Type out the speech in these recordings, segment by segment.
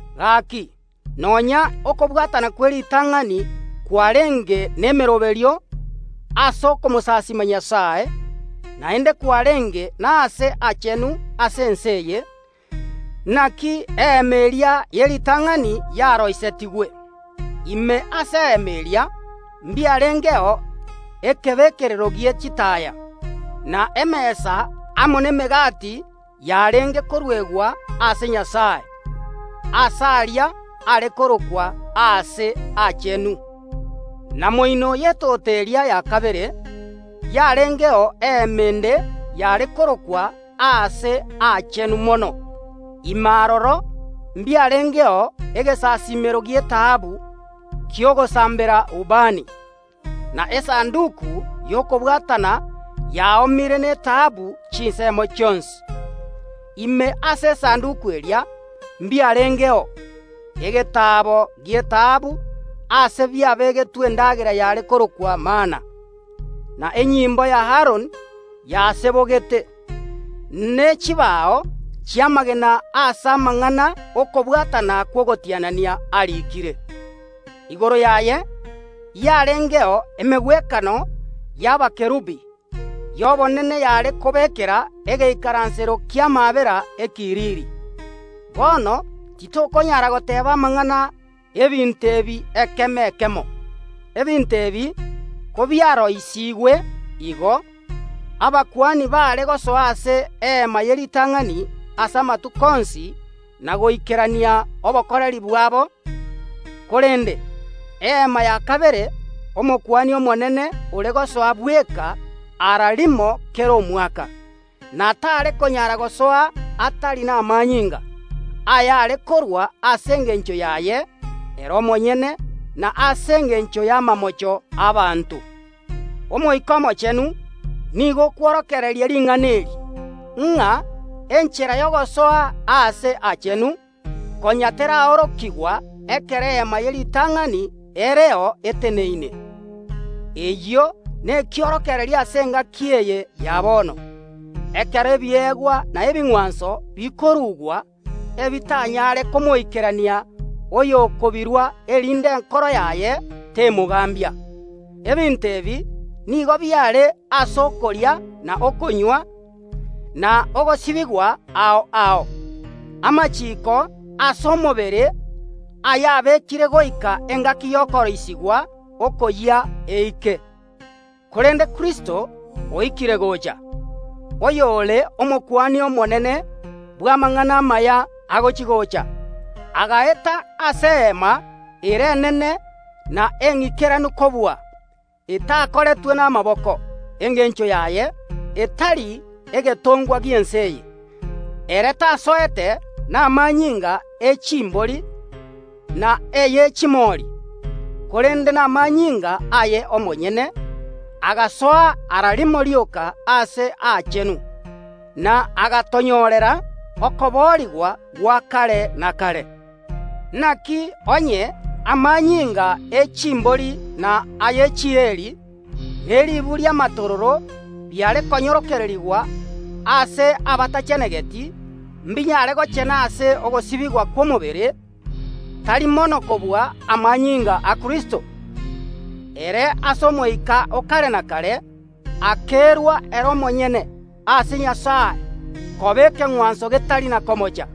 Gaki, nonya okobwatana kw’eritang’ani kwarenge nemeroberio ase okomosasiima Nyasae, naende kwarenge nase aachenu ase ense eye. Naki eema eria ye ritang’ani yaroisetigwe. Ime ase eema eria mbiarengeo ekebekerero gie chitaaya, na emesa amo nemegati yarenge koruegwa ase Nyasae. Aase aria are korokwa Aase Aachenu. Na moino y’etoto eria ya kabere yarengeo eema ende yare korokwa Aase Aachenu Mono. Ime aroro mbiarengeo egesasiimero gi’etaabu ki’ogosambera ubani, na esanduki y’okobwatana yaoomire netaabu chinsemo chionsi. Ime ase esanduki eria mbiarengeo: Egetaabo gi’etaabu aase biabegetwe endagera yare korokwa mana, na enyimbo ya Aroni yasebogete, ne chibao chi’amagena aase amang’ana okobwatana kw’ogotianania ariikire. Igoro yaye yarengeo emegwekano y’ebitongwa bibwate chimbaba y’obonene yare kobekera egeikaransero ki’amaabera ekiriri. Bono titokonyara goteeba amang’ana ’ebinto ebi ekemo ekemo. Ebinto ebi kobiaroisigwe igo, abakuani baare gosoa ase Eema ye ritang’ani ase amatuko onsi na goikerania obokoreri bwabo, korende Eema ya kabere Omokuani Omonene ore gosoa bweka ara rimo kera omwaka, na tare konyara gosoa atari namanyinga, ayare korua ase engencho yaye ere omonyene na ase engencho y’amamocho ’abaanto. Omoika Omochenu nigo okworokereria ring’ana eri, ng’a enchera y’ogosoa Aase Aachenu konya teraorokigwa ekero Eema ye ritang’ani ereo eteneine. Eyio nekiorokererio ase engaki eye ya bono, ekero ebiegwa na ebing’wanso bikorugwa, ebitanyare komoikerania oyokobirua erinde enkoro yaye temogambia. Ebinto ebi nigo biare ase okoria na okonywa, na ogosibigwa ao ao, amachiiko ase omobere ayabekire goika engaki y’okoroisigwa okoyia eike. Korende Kristo oikire gocha, oyore Omokuani Omonene bw’amang’ana amaya agochi‐gocha. Agaeta ase eema ere enene na eng’ikeranu kobua, etakoretwe namaboko, engencho yaye etari egetongwa gi’ense eye. Ere tasoete namanyinga e chimbori na eye chimori, korende namanyinga aye omonyene, agasoa ara rimo rioka Aase Aachenu, na agatonyorera okoboorigwa gwa kare na kare. Naki onye amanyinga e chimbori na aye chieri, ne ribu ri’amatororo biare konyororokerigwa ase abatachenegeti mbinyare gochena ase ogosibigwa kw’omobere, tari mono kobua amanyinga a Kristo, ere ase Omoika o kare na kare akerua ere omonyene ase Nyasae koba ekeng’wanso getari na komocha,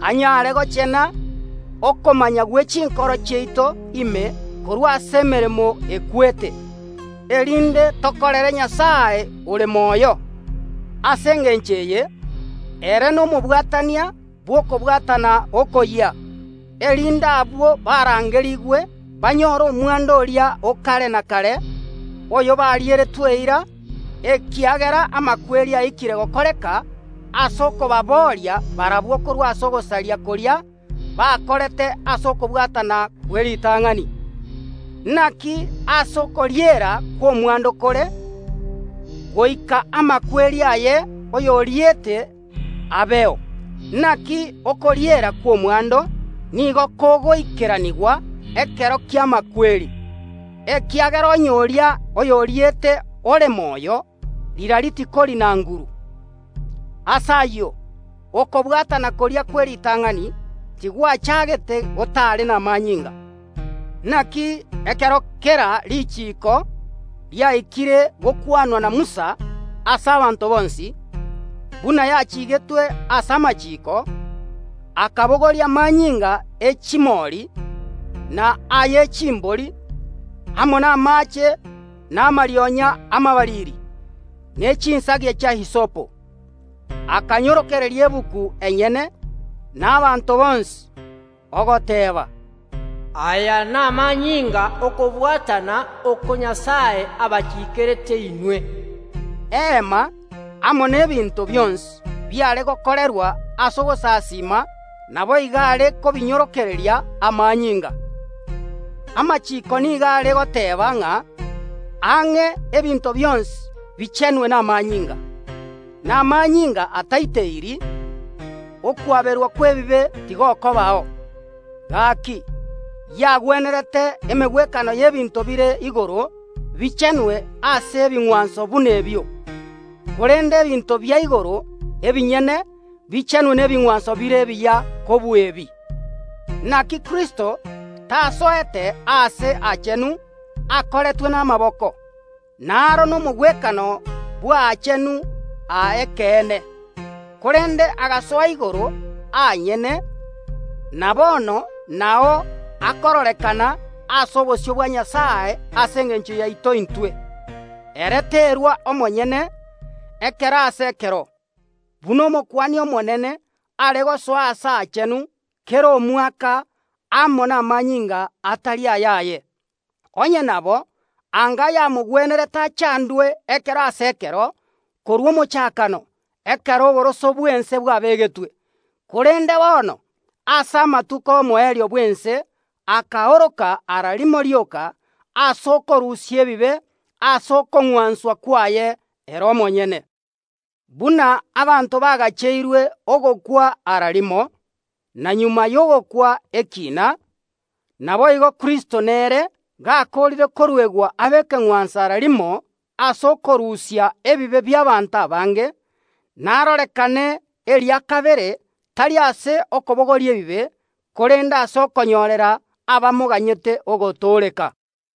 anyare gochena okomanya gwe chinkoro chiaito ime korwa ase emeremo ekwete, erinde tokorere Nyasae ore moyo? Ase engencho eye ere nomobwatania bw’okobwatana okoyia, erinde abwo barangerigwe banyore omwando oria o kare na kare, oyo barieretwe eira, ekiagera amakweri aikire gokoreka ase okobabooria barabwo korwa ase ogosaria koria bakorete ase okobwatana kw’eritang’ani. Naki aase okoriera kw’omwando kore, goika amakweri aye, oyoriete, abeo. Naki okoriera kw’omwando nigo kogoikeranigwa ekero ki’amakweri, ekiagera onye oria oyoriete ore moyo, rirorio tikori na nguru. Ase ayio, okobwatana koria kw’eritang’ani tigwachagete gotare namanyinga, naki ekero kera richiko riaikire gokwanwa na Musa ase abanto bonsi, buna yachigetwe ase amachiiko, akabogoria amanyinga e chimori na aye chimbori amo namaache na amarionya amabariri, ne chinsagia chia hisopo, akanyororokeria egetabu enyene, na abanto bonsi, ogoteeba, “Aya namanyinga ’okobwatana oko Nyasae abachikerete inwe.” Eema amo n’ebinto bionsi biare gokorerwa ase ogosasiima naboigo are kobinyororokereria amanyinga. Amachiiko nigo are goteeba ng’a ang’e ebinto bionsi bichenwe namanyinga, na amanyinga ataiteiri, okwaberwa kw’ebibe tigokobao. Gaki, yagwenerete emegwekano y’ebinto bire igoro bichenwe ase ebing’wanso buna ebio, korende ebinto bia igoro ebinyene bichenwe nebing’wanso bire ebiya kobua ebi. Naki Kristo tasoete Aase Aachenu akoretwe namaboko, naro omogwekano bw’Aachenu a ekeene, korende agasoa igoro aanyene, na bono nao akororekana ase obosio bwa Nyasae ase engencho yaito intwe. Ere terua omonyene ekero ase ekero, buna Omokuani omonene are gosoa Aase Aachenu kera omwaka amo namanyinga atari ayaye. Onye nabo, anga yamogwenerete achandwe ekero ase ekero korwa omochakano, ekero oboroso bw’ense bwabegetwe. Korende bono, ase amatuko ’omoerio bw’ense akaoroka ara rimo rioka ase okorusia ebibe ase okong’wanswa kwaye ere omonyene. Buna abanto bagacheirwe ogokwa ara rimo, na magega y’ogokwa ekiina, naboigo Kristo nere, gakoorire koruegwa abe ekeng’wanso ara rimo ase okorusia ebibe bi’abaanto abange, narorekane eria kabere, tari ase okobogoria ebibe, korende ase okonyorera abamoganyete ogotooreka.